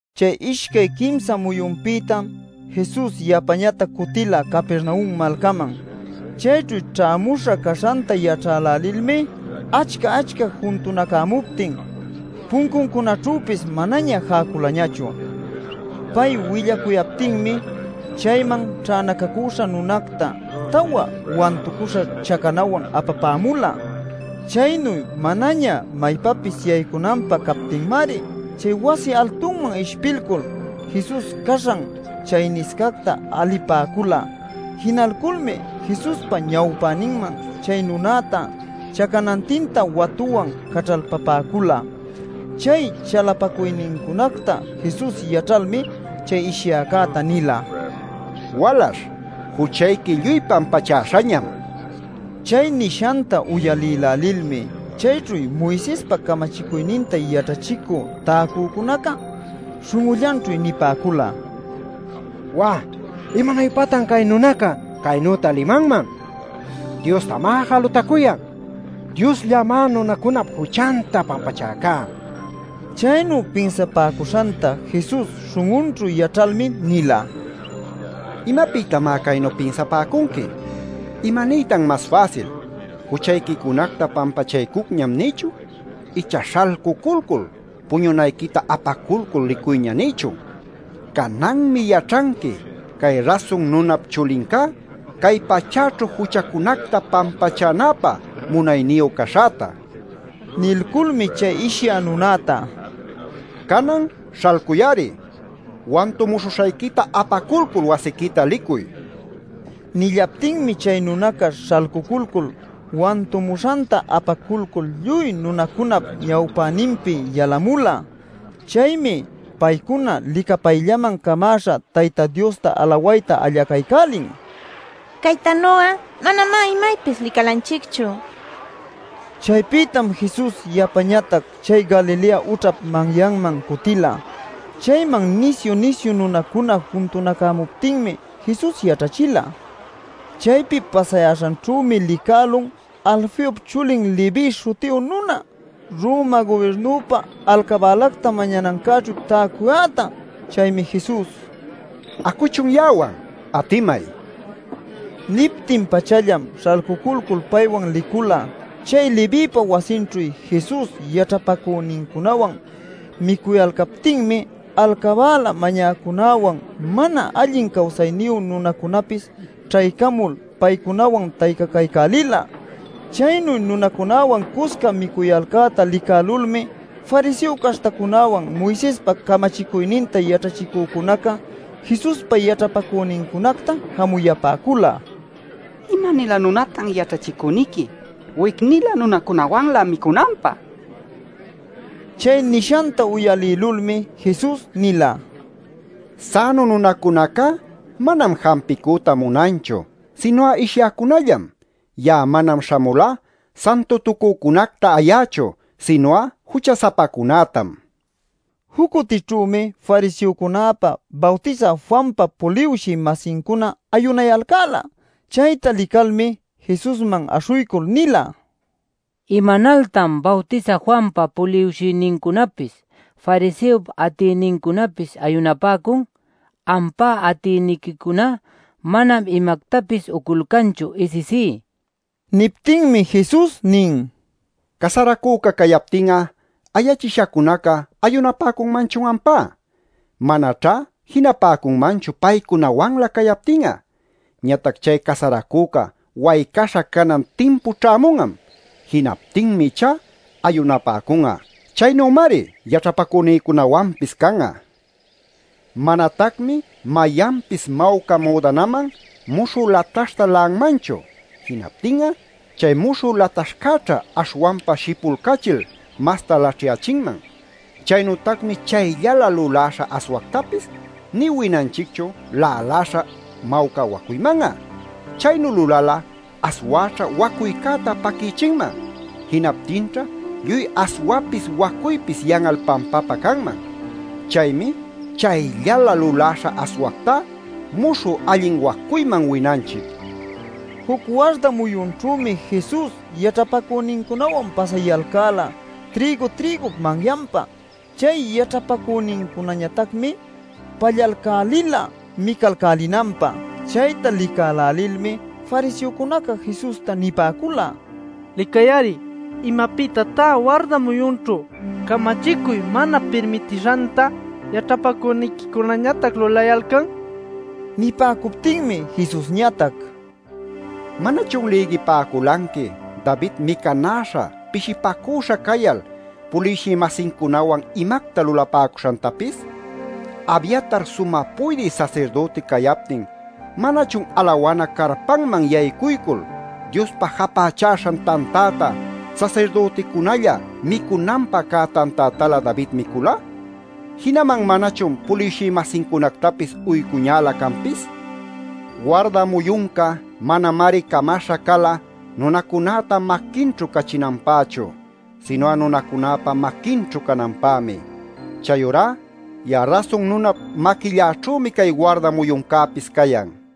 Chay ishcay quimsa muyunpïtam Jesus yapañatac cutila Capernaum malcaman. Chayćhu ćhämuśha caśhanta yaćhälälilmi achca-achca juntunacämuptin puncuncunaćhüpis manaña jäculañachu. Pay willacuyaptinmi chayman ćhänacacüśha nunacta tawa wantucuśha chacanawan apapämula. Chaynu manaña maypapis yaycunanpä captinmari, chay wasi altunman ishpilcul, Jesus caśhan chayniscacta alipäcula. Jinalculmi Jesuspa ñawpäninman chay nunäta chacanantinta watuwan caćhalpapäcula. Chay chalapacuynincunacta Jesus yaćhalmi, chay ishyäcäta nila: “Walaśh, juchayqui lluy pampachäśhañam” nil. Chay nishanta uyalïlälilmi chayćhu Moisespa camachicuyninta yaćhachicü täcücunaca śhun'ullanćhu nipäcula: “¡Wá! ¡Imanuypatan cay nunaca chaynüta limanman! ¡Diostamá jalutacuyan! ¡Diosllamá nunacunap juchanta pampachäcá!” nil. Chaynu pinsapäcuśhanta Jesus śhun'unćhu yaćhalmi nila: “¿Imapïtamá caynu pinsapäcunqui? ¿Imaniytan mas fäsil: ‘Juchayquicunacta pampachaycucñam’ nïchun icha ‘Śhalcuculcul, puñunayquita apaculcul licuyña’ nïchun? Cananmi yaćhanqui cay Rasun Nunap Chulincá, cay pachäćhu juchacunacta pampachänäpä munayniyu caśhäta” nil. Nilculmi chay ishyä nunäta: “Canan ¡śhalcuy-ari! Wantumuśhuśhayquita apaculcul wasiquita licuy” nila. Nillaptinmi chay nunaca śhalcuculcul wantumuśhanta apaculcul lluy nunacunap ñawpäninpi yalumula. Chaymi paycuna licapayllaman camäśha Tayta Diosta alawayta allacaycälin: “¡Caytanu'a manamá imaypis licalanchicchu!” nil. Chaypïtam Jesus yapañatac chay Galilea ućhap manyanman cutila. Chayman nisyu-nisyu nunacuna juntunacämuptinmi Jesus yaćhachila. Chaypi pasayäśhanćhümi licälun Alfeop chulin Leví śhutiyu nuna Roma gubirnupä alcabälacta mañanancäćhu täcuyäta. Chaymi Jesus: “Acuchun ya'awan, atimay” nin. Niptin-pachallam śhalcuculcul paywan licula. Chay Levïpa wasinćhu Jesus yaćhapacünincunawan micuyalcaptinmi alcabäla mañäcücunäwan, mana allin cawsayniyu nunacunäpis ćhaycamul paycunawan taycacaycälila. Chaynu nunacunawan cusca micuyalcäta licälulmi fariseo caśhtacunäwan Moisespa camachicuyninta yaćhachicücunaca Jesuspa yaćhapacünincunacta jamuyapäcula: “¡¿Ima-nilä nunatan yaćhachicüniqui wic-nilä nunacunawanlä micunanpä?!” nil. Chay nishanta uyalïlulmi Jesus nila: “Sänu nunacunacá manam jampicüta munanchu, sinu'a ishyäcunallam. Ya'a manam śhamulá santutucücunacta ayächu, sinu'a jucha-sapacunätam” nil. Juc cutićhümi fariseocunäpa, Bawtisä Juanpa puliwshï-masincuna ayunayalcäla. Chayta licalmi Jesusman aśhuycul nila: “¿Imanaltan Bawtisä Juanpa puliwshïnincunapis, fariseop atïnincunapis ayunapäcun, ampa atïniquicuná mana imactapis uculcanchu isisí?” nil. Niptinmi Jesus nin: “¿Casaracüca cayaptin'a ayachishacunaca ayunapäcunmanchun ampá? Manaćhá jinapäcunmanchu paycunawanlä cayaptin'a. Ñatac chay casaracüca waycaśha canan timpu ćhämun'am. Jinaptinmi ichá ayunapäcun'a. Chaynümari yaćhapacünïcunawanpis can'a. “Manatacmi mayanpis mawca müdanaman muśhü lataśhta la'anmanchu. Jinaptin'a chay muśhü lataśhcäćha aśhwanpa shipulcachil masta laćhyächinman. Chaynütacmi chayllalä luläśha aswactapis nï winanchicchu läläśha mawca wacuyman'a. Chaynu lulal'a aswäćha wacuycäta paquïchinman; jinaptinćha lluy aswapis wacuypis yan'al pampapä canman. Chaymi chayllalä luläśha aswactá muśhü allin wacuyman winanchic” nil. Juc warda muyunćhümi Jesus yaćhapacünincunawan pasayalcäla trïgu-trïgup manyanpa. Chay yaćhapacünincunañatacmi pallalcälila micalcälinanpä. Chayta licälälilmi fariseocunaca Jesusta nipäcula: “Licay-ari. ¡¿Imapïtatá warda muyunćhu camachicuy mana pirmitishanta yaćhapacüniquicunañatac lulayalcan?!” nil. Nipäcuptinmi Jesusñatac: “¿Manachun lïgipäculanqui David micanäśha pishipacüśha cayal puliwshï-masincunawan imacta lulapäcuśhantapis? Abiatar sumä puydï sasirdüti cayaptin ¿manachun alawana carpanman yaycuycul Diospä japächäśhan tantäta, sasirdüticunälla micunanpä cä tantätalä David micüla? Jinaman ¿manachun puliwshï-masincunactapis uycuñälä canpis? Warda muyunca manamari camaśha cala nunacunäta maquinćhu cachinanpächu, sinu'a nunacunäpa maquinćhu cananpämi. Chayurá ya'a Rasun Nunap maquilläćhümi cay warda muyuncäpis cayan” nil.